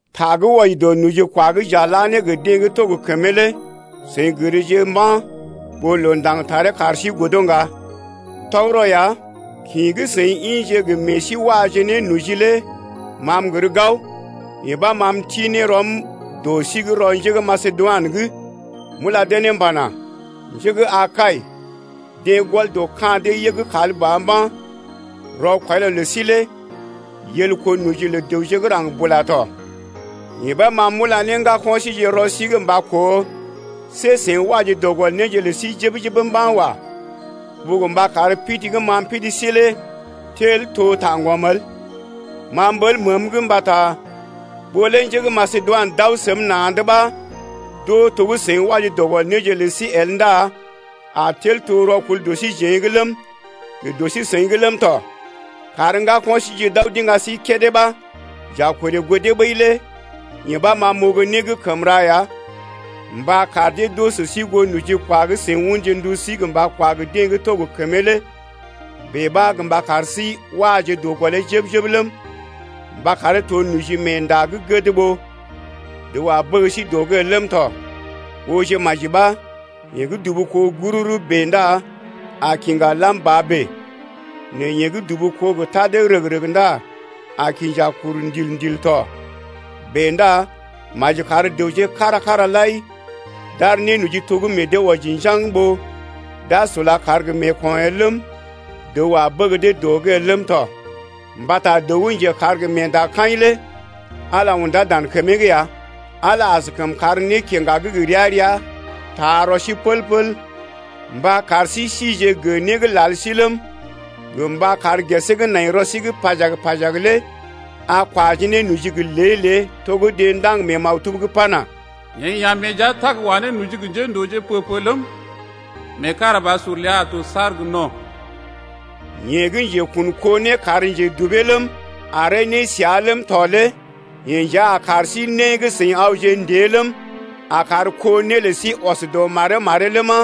Ta gə́ wɔji dɔ nojikwa gə́ j’a la ne gə deḛ gə́ to gə kəmee lé seḭ gərje mba̰ ɓó loo ndaŋg taree kar sí godo ŋga. Tɔgərɔ ya, kḭ gə́ seḭ ḭje gə́ meḛ sí waje ne noji lé ma m’gər gao, yee ɓa ma m’ti ne rɔm m’wɔji ne dɔ sí’g rɔ njé gə́ Masedoinə’g m’ula dee ne m’pana: Njé gə́ Akai deḛ gɔl dɔ ka̰ dee yəg kal ba mba̰: rɔkwɔilɔ lə sí lé yel kó noji lə dəwje gə́ raŋg bula tɔ. Yee ɓa ma m’ula ne ŋgako̰ síje rɔ sí’g mba koo, see seḭ waje dɔ gɔl néje lə sí jəb-jəb mba̰ wa ɓó gə mba kar pidi gə́ ma m’pidi sí lé tel to taŋgɔm el. Ma m’ɓəl məəm’g mbata ɓó lé njé gə́ Masedoinə d’aw səm na̰’d ɓa d’oo to gə́ seḭ waje dɔ gɔl néje lə sí el ndá a tel to rɔkul dɔ síjeḛ’g ləm, gə dɔ sí-seḭ’g ləm tɔ. Kar ŋgako̰ síje d’aw d’iŋga sí kédé ɓa, j’a korè goo dee ɓəi lé yee ɓa ma m’oo gə́ né gə́ kəm ra ya mba kar dee d’oo sə sí goo nojikwa gə́ seḭ unje ndu sí gə mba kwa gə deḛ gə́ to gə kəmee lé bèe ɓa gə mba kar sí waje dɔ gɔlee jəb-jəb ləm, mba karee to nojimeenda gə́ gəd ɓó dəw a bəg sí dɔ’g el ləm tɔ. Ooje maji ɓa, yeḛ gə́ dubu kó gururu bèe ndá a kiŋga lam ba bèe, nɛ yeḛ gə́ dubu kó gə tadee rəg-rəg ndá a kinja kuru ndil-ndil tɔ. Bèe ndá maji kar dəwje kára-kára lai d’ar nénoji to gə́ meḛ dee wɔji njaŋg ɓó d’a sula kar gə meeko̰ el ləm, dəw a bəg dee dɔ’g el ləm tɔ, mbata dəw gə́ njekar gə meendakaḭ lé Ala undá dan kəmee’g ya. Ala askəm kar nékiŋga gə́ ria-ria taa rɔ sí pəl-pəl, mba kar sí sije gə né gə́ lal sí ləm, gə mba kar gesee gə́ nai rɔ sí’g pajag-pajag lé a kwaje ne noji gə lée-lée to gə́ deḛ ndaŋg mee maktub’g pana: Yeḛ ya̰ meḛ jia tag wa ne noji gə njéndooje pə-pə ləm, Meekarabasur ləa a to saar gə no̰. Yeḛ gə́ njekun kó né kar njedubee ləm, aree nésəa ləm tɔ lé yeḛ nja a kar sí né gə́ seḭ awje ndée ləm, a kar kó né lə sí ɔs dɔ maree-maree ləma,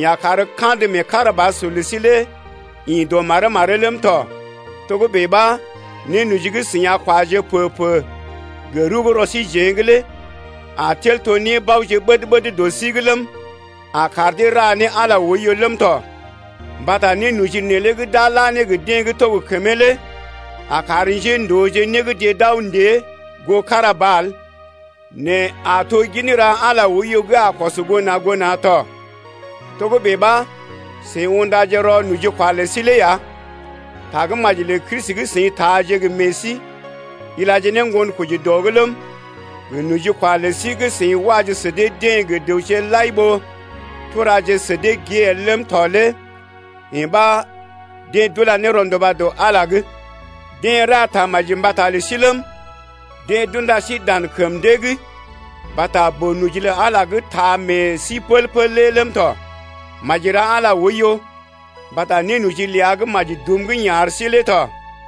yeḛ a kar kandə meekarabasur lə sí lé ḭ dɔ maree’g maree’g ləm tɔ. Togə́bè ɓa nénoji gə́ seḭ a kwaje pə-pə gə rəw gə́ rɔ síjeḛ lé a tel to nébaoje ɓəd-ɓəd dɔ sí’g ləm, a kar dee ra ne Ala oiyo ləm tɔ. Mbata nénoji neelé gə́ d’a la ne gə deḛ gə́ to gə kəmee lé a kar njéndooje né gə́ deḛ d’aw ndée goo kára ba el nɛ a to gin ra Ala oiyo gə́ a kɔs goo na̰ goo na̰ tɔ. Togə́bè ɓa, seḭ undaje rɔ nojikwa lə sí lé ya, Tagə́maji lə Kristi gə́ seḭ taaje gə meḛ sí ilaje ne ŋgonkoji dɔ’g ləm, gə nojikwa lə sí gə́ seḭ waje sə dee-deḛ gə dəwje lai ɓó turaje sə dee gée el ləm tɔ lé yee ɓa deḛ d’ula ne rɔnduba dɔ Ala’g ya. Deḛ ra tamaji mbata lə sí ləm, deḛ d’unda sí dan kəm dee’g mbata boo-noji lə Ala lé gə́ taa meḛ sí pəl-pəl lé ləm tɔ. Maji ra Ala lé oiyo mbata nénoji ləa gə́ maji dum gə́ yeḛ ar sí lé tɔ.